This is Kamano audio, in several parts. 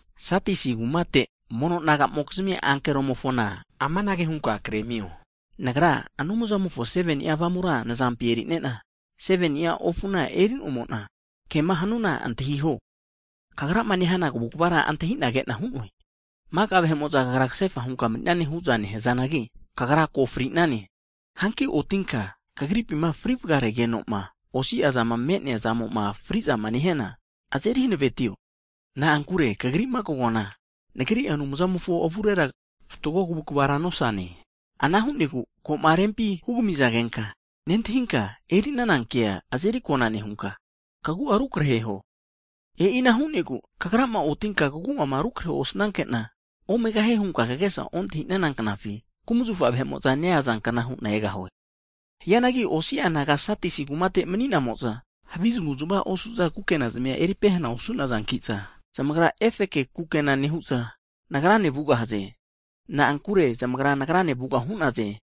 Sadisi kumate mono naga'mokizmi ankeromofona amanage hunka kremio, Nagra Anumzamofo 7ni'a Avamura nazampina eri'nena, 7ni'a ofuna eri'nomo'na, ke'ma hanuana antahiho. Kagrama nehana kavukvara antahi'na ke'na hu'noe. Maka vahe'mo'za kagra kasefa hunka mani'nane hu'za nehazanagi, kagra ko fri'nane. Hanki otinka, kagripima fri vagaregeno'ma osiazama me'neazamo'ma fri'zama nehiana, azeri hanavetio. Na'ankure kagri'ma kagoana, Nagri Anumzamofo avurera, fatgo kavukvara nosane. Ana hu'negu ko'ma rempi hugamizagenka, nentahinka eri'nana kea azeri kona nehunka, kagu'a rukrehuo. E'ina hu'negu, kagrama otinka, kagu'ama rukrehe osnanke'na, omegahie hunka kagesa ontahi'nana knafi, kumazafa vahe'mo'za neazankna hu'na egahue. Hianagi osi'a naga Sadisi kumate mani'namo'za, havi zamavuzmava osu'za kukena zamia eri pehana osu'nazanki'za, zamagra efeke kukena nehu'za, Nagrane kana vugahaze. Na'ankure zamagra Nagrane vuga hu'naze.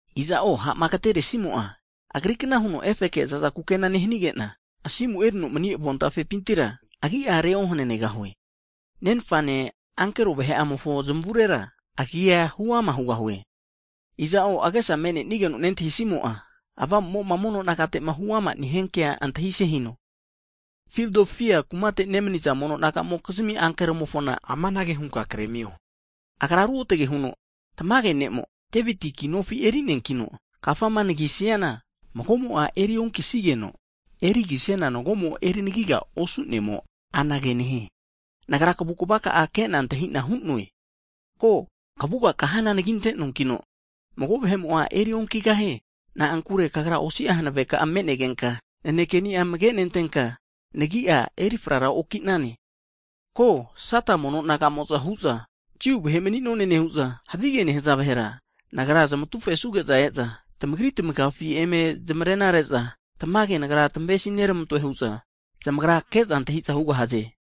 Iza'o ha'ma agteresimo'a zamagrikna huno efeke za'za kukena nehanige'na, asimuma erino mani avontafepintira, agi'a reohananegahue. Nenfane, ankero vahe'amofo zmavurera agi'a huama hugahue. Iza'o agesama me'nenigeno nentahisimo'a, Avamu'mo'ma mono nagate'ma huamama nehia kea, antahise hino. Fildelfia kumate nemaniza mono naga'mokizmi ankeromofona amanage hunka kremio, Agra ruotge huno, tamage Ne'mo, Deviti kinofi eri'neankino, kafama anagisiana, magomo'a eri onkisigeno, erigisiana mago'mo'a eri anagigara osu'nemo anage nehie. Nagra kavukvaka'a kage'na antahi'na hu'noe, ko, kavuga kahana anaginte'noankino, mago vahe'mo'a erionkigahie. Na'ankure kagra osi'a hanaveka'a me'negenka, nanekeni'a amagenentenka, nagi'a eri frara oki'nane. Ko, Sata mono naga'mo'za hu'za, Jiu vahe mani'none nehu'za havige nehaza vahera, Nagra zamatufesuge'za e'za, tamagri tamagafi eme zamarenare'za, tamage Nagra tamavesineramantoe hu'za, zamagra ke'za antahi'za hugahaze.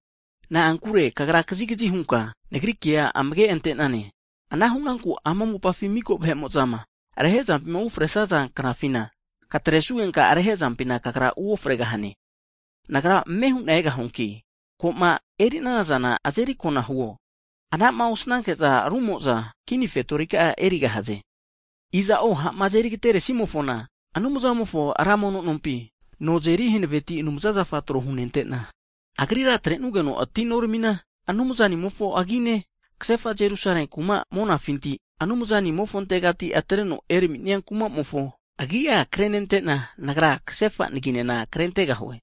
Na'ankure kagra kazigazi hunka, Nagri kea amage ante'nane. Ana hu'nanku ama mopafi miko vahe'mo'zama rehezampima ufresaza knafina, katresugenka rehezampina kagra uofregahane. Nagra ame hu'na egahuanki, ko'ma eri'nana zana azeri kona huo, ana'ma osnanke'za rumo'za kini fetorika'a erigahaze. Iza'o ha'ma azeri agateresimofona, Anumzanimofo ra mono nompi, no azeri hanaveti anumza zafa tro hunente'na, agrira atrenugeno atinoramina, Anumzanimofo agine, kasefa Jerusalemi ku'ma monafinti, Anumzanimofontega atreno eraminia kuma'mofo agi'a krenente'na, Nagra kasefa naginena krentegahue.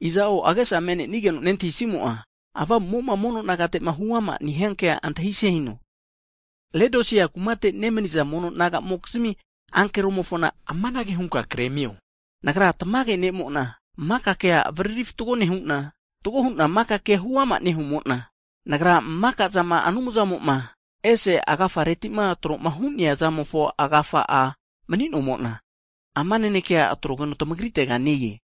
Iza'o agesama me'nenigeno'ma nentahisimo'a, Avamu'mo'ma mono nagate'ma huama'ma nehiankea antahise hino. Laodisia kumate nemaniza mono naga'mokizmi ankeromofona amanage hunka kremio, Nagra tamage ne'mo'na, maka kea avariri fatgo nehu'na, fatgo hu'na maka kea huama nehumo'na, Nagra maka zama Anumzamo'ma, ese agafereti'ma tro'ma hu'nea zamofo agafa'a mani'nomo'na, ama naneke atrogeno kagritega e-e.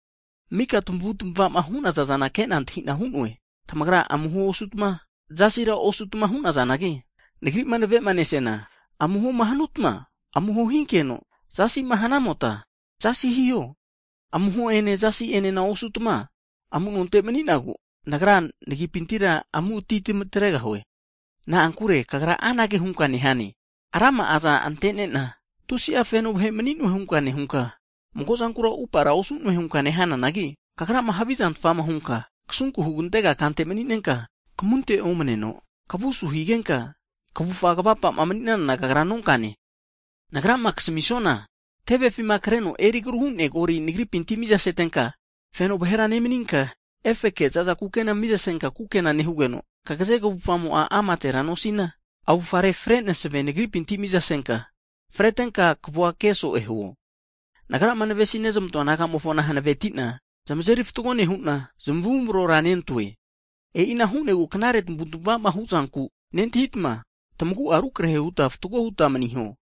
Mika tamavutmava hunazana ke'na antahina hu'noe. Tamagra amuho osutma, zasira osutma hunazanagi, Nagri'ma nave'ma nesiana, amuhoma hanamotma, amuho hinkeno, zasima hanamota, zasi hiho. Amuhone zasi'enena osutma, amunonte mani'nagu, Nagra nagipintira amu'ati tamatregahue. Na'ankure kagra anage hunka nehane, rama'aza ante'nena, tusi'a fenone vahe mani'noe hunka nehunka, mago'zankura upara osu'noe hunka nehananagi, kagrama havizantfama hunka, kasunku hugantega kante mani'nenka, kamunte omaneno, kavu asu higenka, kavufa kavapa mani'nanana kagra nonkane. Nagrama kasamisuana, tevefima kreno eri agruma hu'nea golia Nagripinti mizasetenka, feno vahera nemaninka, efeke za'za kukena miza senka kukena nehugeno, kagaze kavufamo'a amatera nosina, avure fre masave Nagripinti miza senka, fretenka kavua ke so'e huo. Nagrama navesizmantoa naga'mofona hanavetina, zamazeri fatgo nehu'na, zamavumarora nentoe. E'ina hu'negu knare tamavu'tmavama hu'zanku nentahitma, tamagu'a rukrehe huta fatgo huta maniho.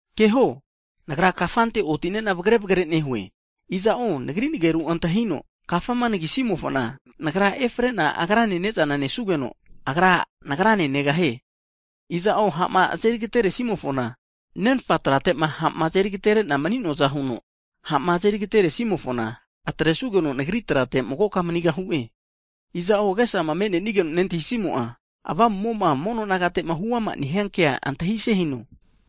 Keho, Nagra kafante oti'ne'na vagre vagre nehue. Iza'o Nagri nageru antahino, kafama anagisimofona, Nagra efre'na agrane ne'zana nesugeno, agra Nagrane negahie. Iza'o ha'ma azeri agateresimofona, Nenfa trate'ma ha'ma azeri agatere'na mani'noaza huno, ha'ma azeri agateresimofona, atresugeno Nagri trate magoka manigahu'e. Iza'o agesama me'nenigeno'ma nentahisimo'a, Avamu'mo'ma mono nagate'ma huama'ma nehiankea antahise hino.